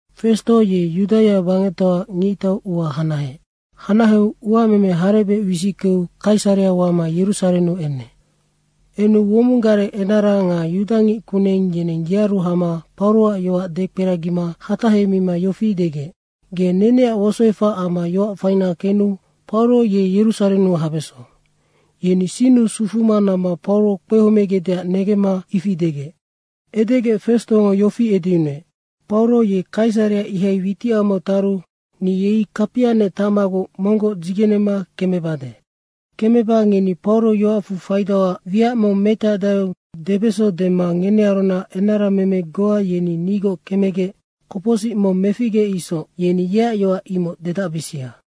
Festo ye Yudaia bangectoaac ngictau ua hanaheec. Hanaheu uameme harebec wisickeu Kaisarea wama Yerusarennu enec. Enu womong gareng enara nga yudangickuneng yeneng yearu hama Pauroac yoac dekperagima hatahemima yofi degec, “Ge neneac wosoefac amma yoac faina kenu Pauro ye Yerusarennu habeso.” Yeni sinnu sufuma namma Pauro kpehomegecdeac negemma ifi degec. Edegec Festongo yofi edeyunuec, “Pauro ye Kaisarea ihai witicamau taru ni yei kapianec tacmaguc monggoc dzigenema kemebade. Kemeba ngeni Pauro yoacfu faidauac wiac mong metacdaeu debeso dema ngenearunac enarameme goa yeni nigoc kemegec kopocsic mong meficgeec isoc yeni yeac yoac imoc dedacbisia.”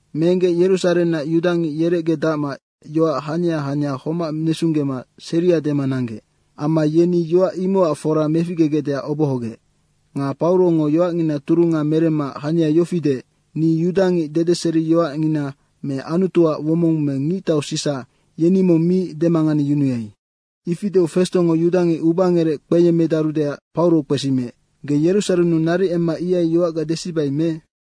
Meenggec Yerusarennac yudangic yerecgedacma yoac hania hania homac nesunggema seria dema nanggec. Amma yeni yoac imocac fora meficgegecdeac obohogec. Nga Paurongo yoacngina turunga meremma hania yofi deec, “Ni yudangic dedeseriyoacngina me Anutuac womong me ngictau Sisa, yeni mong mi demanganeyunuai.” Ifi deu Festongo yudangic ubangerec kpeyemmedarudeac Pauro kpesimiec, “Ge Yerusarennu naric emma ihai yoacga desibai me?”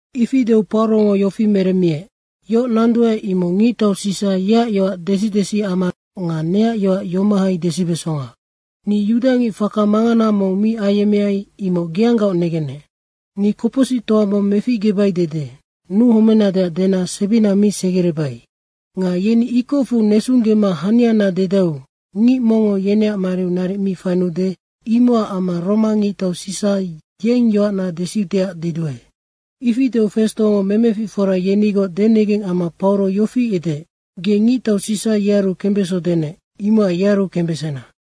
Ifi deu Paurongo yofi meremmiec, “Yoc nanduae, imoc ngictau Sisa yeac yoac desi desiamanoc nga neac yoac yomohai desibesonga. Ni yudangic faka mangana mong mi ayemmeai, imoc geanggaoc negennec. Ni kopocsictoa mong meficgebai dede nuhomenadeac dena sebina mi segerebai. Nga yeni ikocfu nesunggema haniana dedaeu ngic mongngo yeneac mariu naric mi fainuude, imocac amma Roma ngictau Sisa yeng yoacna desiudeac deduae.” Ifi deu Festongo memeficfora yenigoc denegeng amma Pauro yofi edeec, “Ge ngictau Sisa yearu kembeso denec, imocac yearu kembesena.”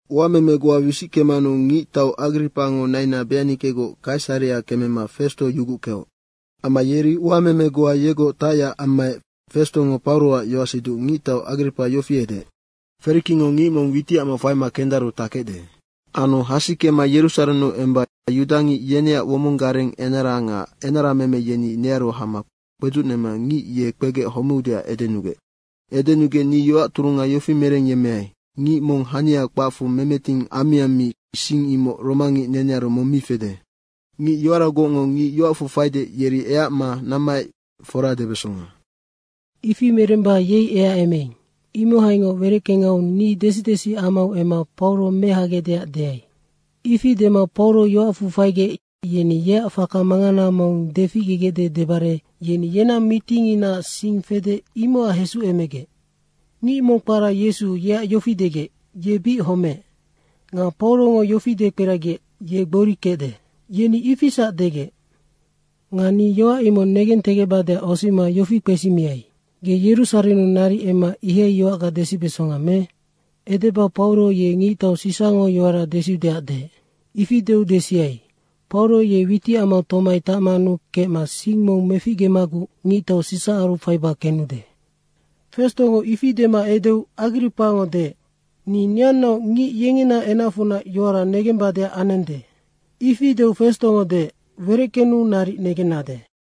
Uameme goa wisickemanu ngictau Agripango naina Beanikegoc Kaisarea kemema Festo yuguckeoc. Amma yeri uameme goa yegoc tacyac ammaec Festongo Pauroac yoacsiduc ngictau Agripa yofi edeec, “Ferikingo ngic mong witicamau faima kendaru takecde. Anu hasikema Yerusarennu emba yudangic yeneac womong gareng enara nga enarameme yeni nearu hama kpedzucnema ngic ye kpegec homeudeac edenugec. Edenugec ni yoac turunga yofi merengyemmeai, ‘Ngic mong hania kpacfu memeting ammiammi, sing imoc romangic nenearu mong mi fede. Ngic yoaragocngo ngic yoacfu faide, yeri eacma nammaec fora debesonga. Ifi meremba yei eacemeing, imohaingoc wereckengau ni desi desiamau emma Pauro mehagecdeac deai.’ Ifi dema Pauro yoacfu faigec yeni yeac faka mangana mong deficgegecde debare yeni yenang mitinginaac sing fede, imocac hesucemegec. Ngic mong kpara Yesu, yeac yofi degec, ‘Ye bic homeec.’ Anu Paurongo yofi dekperagiec, ‘Ye gbori kecde.’ Yeni ifisac degec. Nga ni yoac imoc negentegecbadeac osima yofi kpesimiai, ‘Ge Yerusarennu naric emma ihai yoacga desibesonga me?’ Edeba Pauro ye ngictau Sisango yoara desiudeac deec. Ifi deu desiai, ‘Pauro ye witicamau tomai tacmanu kecma sing mong meficgemaguc ngictau Sisaaru faiba kenude.’” Festongo ifi dema edeu Agripango deec, “Ni neannaoc ngic yengena enacfunac yoara negembadeac anende.” Ifi deu Festongo deec, “Wereckenu naric negennade.”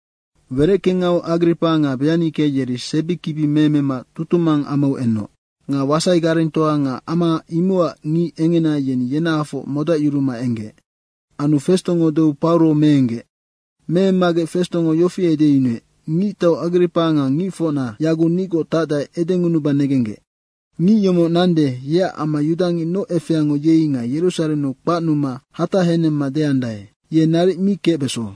Wereckengau Agripa nga Beanike yeri sebikibi meemema tutumang amau enoc. Nga wasai garengtoa nga ama imocac ngic engena yeni yenahafoc modacyuruma enggec. Anu Festongo deu Pauro meenggec. Meemmagec Festongo yofi edeyunuec, “Ngictau Agripa nga ngicfocna yaguc nigoc tacdae, edengunuba negenggec: Ngic yomoc nande, yeac amma yudangic noc efeango yei nga Yerusarennu kpacnuma hatahenemma deandae, ‘Ye naric mi kecbeso.’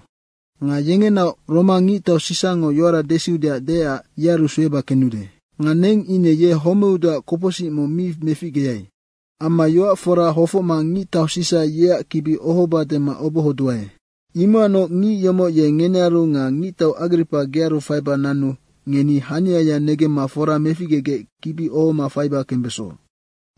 Nga yengenaoc Roma ngictau Sisango yoara desiudeac deecac yearu sueba kenude. Nga neng ine ye homeudeac kopocsic mong mi meficgeai. Amma yoac fora hofocma ngictau Sisa yeac kibi ohoba dema obohoduae. Imocacnoc ngic yomoc ye ngenearu nga ngictau Agripa gearu faiba nanu ngeni haniaya negemma fora meficgegec kibi ohoma faiba kembeso.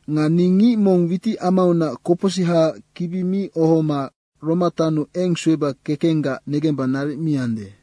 Nga ni ngic mong witicamaunac kopocsihaac kibi mi ohoma Roma taonnu eng sueba kekenggac negemba naric mi ande.”